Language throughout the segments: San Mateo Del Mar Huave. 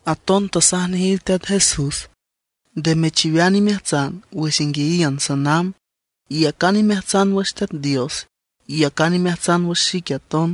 Aton tasaj nejiw Teat Jesús: ―Nde mechiwean imeajtsan wüx inguiayiün sanamb. Iyacan imeajtsan wüx Teat Dios; iyacan imeajtsan wüx xique aton.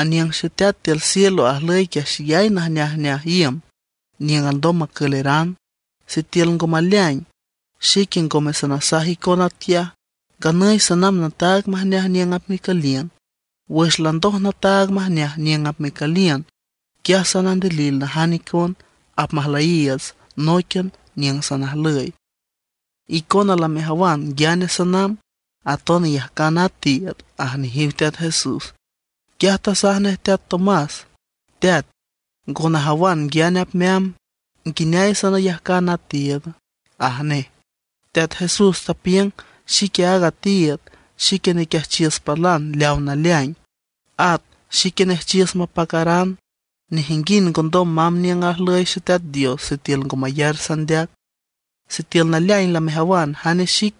Aniüng Xeteat tiül cielo ajlüy quiaj xeyay najneajneaj iüm niüng alndom macüleran. Sitiül ngo maleaing, xique ngome sanasaj icon atquiaj. Nganüy sanamb nataag majneaj niüng apmecüliün. Wüx landoj nataag majneaj niüng apmecüliün, quiaj sanandilil najan icon, apmajlüyiiüts nóiquian niüng sanajlüy. Icona lamejawan nguiane sanamb; aton iyajcan a tiiüd ―aj nejiw Teat Jesús. Quiaj tasaj nej teat Tomás: ―Teat, ngo najawan nguiane apmeamb, ¿nguineay sanayajcan a tiiüd? ―aj nej. Teat Jesús tapiüng: ―Xique aaga tiiüd, xique nequiajchiüs palan leawa naleaing, at xique nejchiüs mapacaran. Nejinguind ngondom mamb niüng ajlüy Xeteat Dios sitiül ngo mayar sandeac. Sitiül naleaing lamejawan jane xic,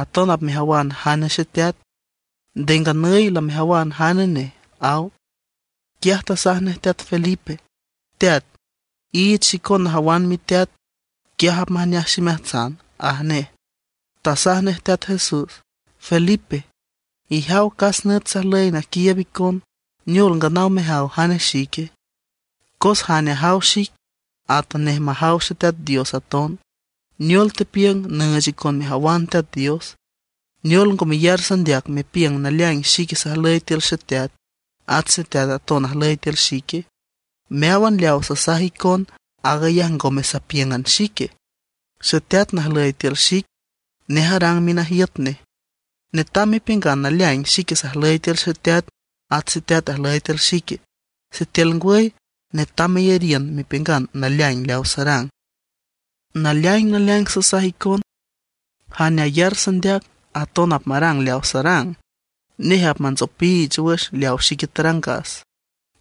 aton apmejawan jane Xeteat. Nde nganüy lamejawan jane nej ―aw. Quiaj tasaj nej teat Felipe: ―Teat, iich xicon najawan miteat, quiaj apmajneaj ximeajtsan ―aj nej. Tasaj nej Teat Jesús: ―Felipe, ijaw cas nüt sajlüy naquiiüb icon, ¿neol nganaw mejaw jane xique? Cos jane ajaw xic, atanej majaw Teat Dios aton. ¿Neol tepiüng nüüch icon mejawan Teat Dios? ¿Neol ngo meyar sandeac mepiüng naleaing xique sajlüy tiül Xeteat, at Xeteat aton ajlüy tiül xique? Meáwan leaw sasaj icon, aag ayaj ngome sapíüngan xique. Xeteat najlüy tiül xic, nej arang minajiüt nej. Netam mepiüngan naleaing xique sajlüy tiül Xeteat, at Xeteat ajlüy tiül xique. Sitiül ngwüy netam meyariün mepiüngan naleaing leawa sarang. Naleaing naleaing sasaj icon, jane ayar sandeac, aton apmarang leaw sarang. Nej apmantsopiich wüx leawa xique tarangas,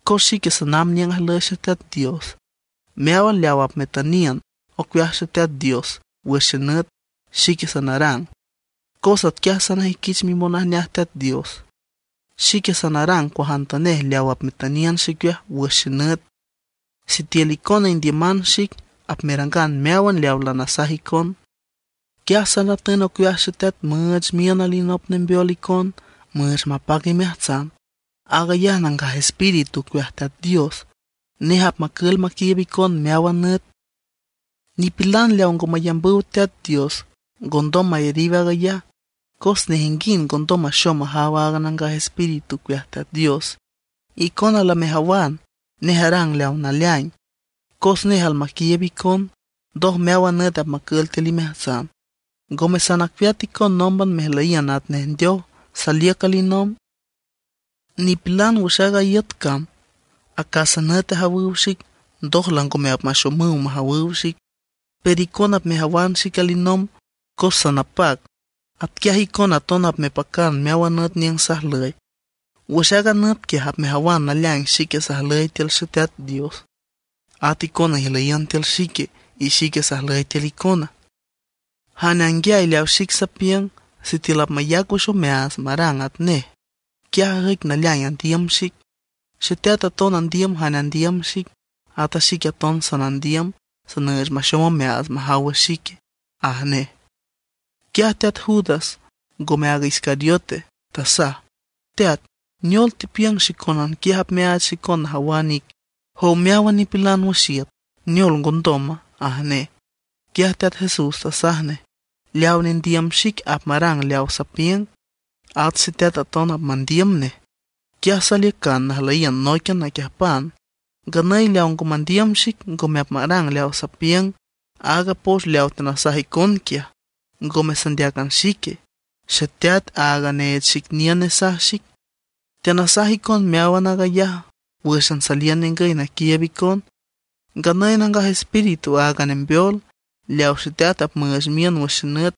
cos xique sanamb niüng ajlüy Xeteat Dios. Meáwan leaw apmetüniün ocueaj Teat Dios wüx xenüt, xique sanarang, cos atquiaj sanajüiquich mimonajneaj Teat Dios. Xique sanarang cuajantanej leaw apmetüniün xicueaj wüx xenüt. ’Sitiül icona indiüman xic, apmerangan meáwan leaw lanasaj icon. Quiaj sanatün ocueaj Xeteat müüch miün alinop nembeol icon müüch mapac imeajtsan. Aag ayaj Nangaj Espíritu ocueaj Teat Dios. Nej apmacül maquiiüb icon meáwan nüt. Nipilan leaw ngo mayambüw Teat Dios ngondom mayariw aag ayaj, cos nejinguind ngondom maxom majaw aaga Nangaj Espíritu ocueaj Teat Dios. Icona lamejawan, nej arang leaw naleaing, cos nej almaquiiüb icon, ndoj meáwan nüt apmacül tiül imeajtsan. Ngome sanacueat icon nómban mejlüyiün atnej ndeoj; saliüc alinomb. Nipilan wüx aaga iüt cam acásan nüt ajawüw xic, ndoj langome apmaxomüw majawüw xic; pero icona apmejawan xic alinomb cos sanapac. Atquiaj icona aton apmepacan meáwan nüt niüng sajlüy. Wüx aaga nüt quiaj apmejawan naleaing xique sajlüy tiül Xeteat Dios; at icona ijlüyiün tiül xique, y xique sajlüy tiül icona. Jane anguiay leawa xic sapiüng, sitiül apmayac wüx omeaats marang atnej, quiaj ajüic naleaing andiüm xic. Xeteat aton andiüm jane andiüm xic, ata xique aton sanandiüm, sanüüch maxom omeaats majaw wüx xique, ―aj nej. Quiaj teat Judas, ngome aaga Iscariote, tasaj: ―Teat ¿neol tepiüng xicónan quiaj apmeaach xicon najawan ic, jow meáwan nipilan wüx iüt, neol ngondoma? ―aj nej. Quiaj Teat Jesús tasaj nej: ―Leaw nendiüm xic apmarang leawa sapiüng. At Xeteat aton apmandiüm nej, quiaj saliücan najlüyiün nóiquian naquiüjpan. Nganüy leaw ngo mandiüm xic ngome apmarang leawa sapiüng. Aaga poch leawa teanasaj icon quiaj, ngome sandeácan xique, Xeteat áaga neech xic niün nesaj xic. ’Teanasaj icon meáwan aag ayaj wǘxan saliün ningüy naquiiüb icon. Nganüy Nangaj Espíritu, aaga Nembeol, leawa Xeteat apmüüch miün wüx xenüt,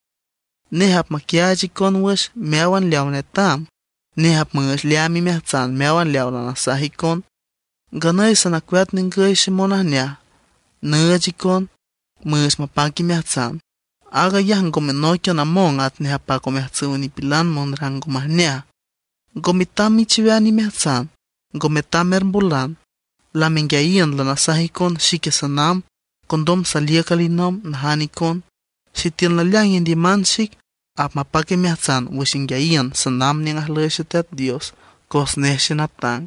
nej apmaquiaach icon wüx meáwan leaw netam. Nej apmüüch leaam imeajtsan meáwan leaw lanasaj icon. ’Nganüy sanacueat ningüy xemonajneaj nüüch icon, müüch mapac imeajtsan; aag ayaj ngome nóiquian among atnej apac omeajtsüw nipilan monrang ngo majneaj. Ngo metam mechiwean imeajtsan, ngo metam mermbolan. Lamenguiayiün lanasaj icon xique sanamb, condom saliüc alinomb najan icon. Sitiül naleaing indiüman xic, apmapac imeajtsan wüx inguiayiün sanamb niüng ajlüy Xeteat Dios, cos nej xenatang.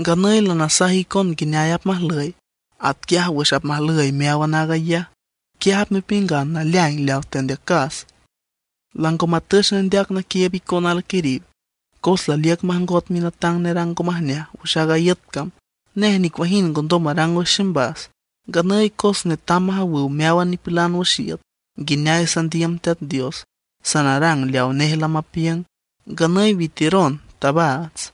Nganüy lanasaj icon nguineay apmajlüy; atquiaj wüx apmajlüy meáwan aag ayaj, quiaj apmepiüngan naleaing leaw tandeacas. ’Lango matüch nendeac naquiiüb icon alquiriw, cos laliüc majngot minatang nerang ngo majneaj wüx aaga iüt cam. Nej nicuajind ngondom marang wüx ximbas. Nganüy cos netam majawüw meáwan nipilan wüx iüt nguineay sandiüm Teat Dios, sanarang leawa nej lamapiüng. Nganüy witiüron, tabaats.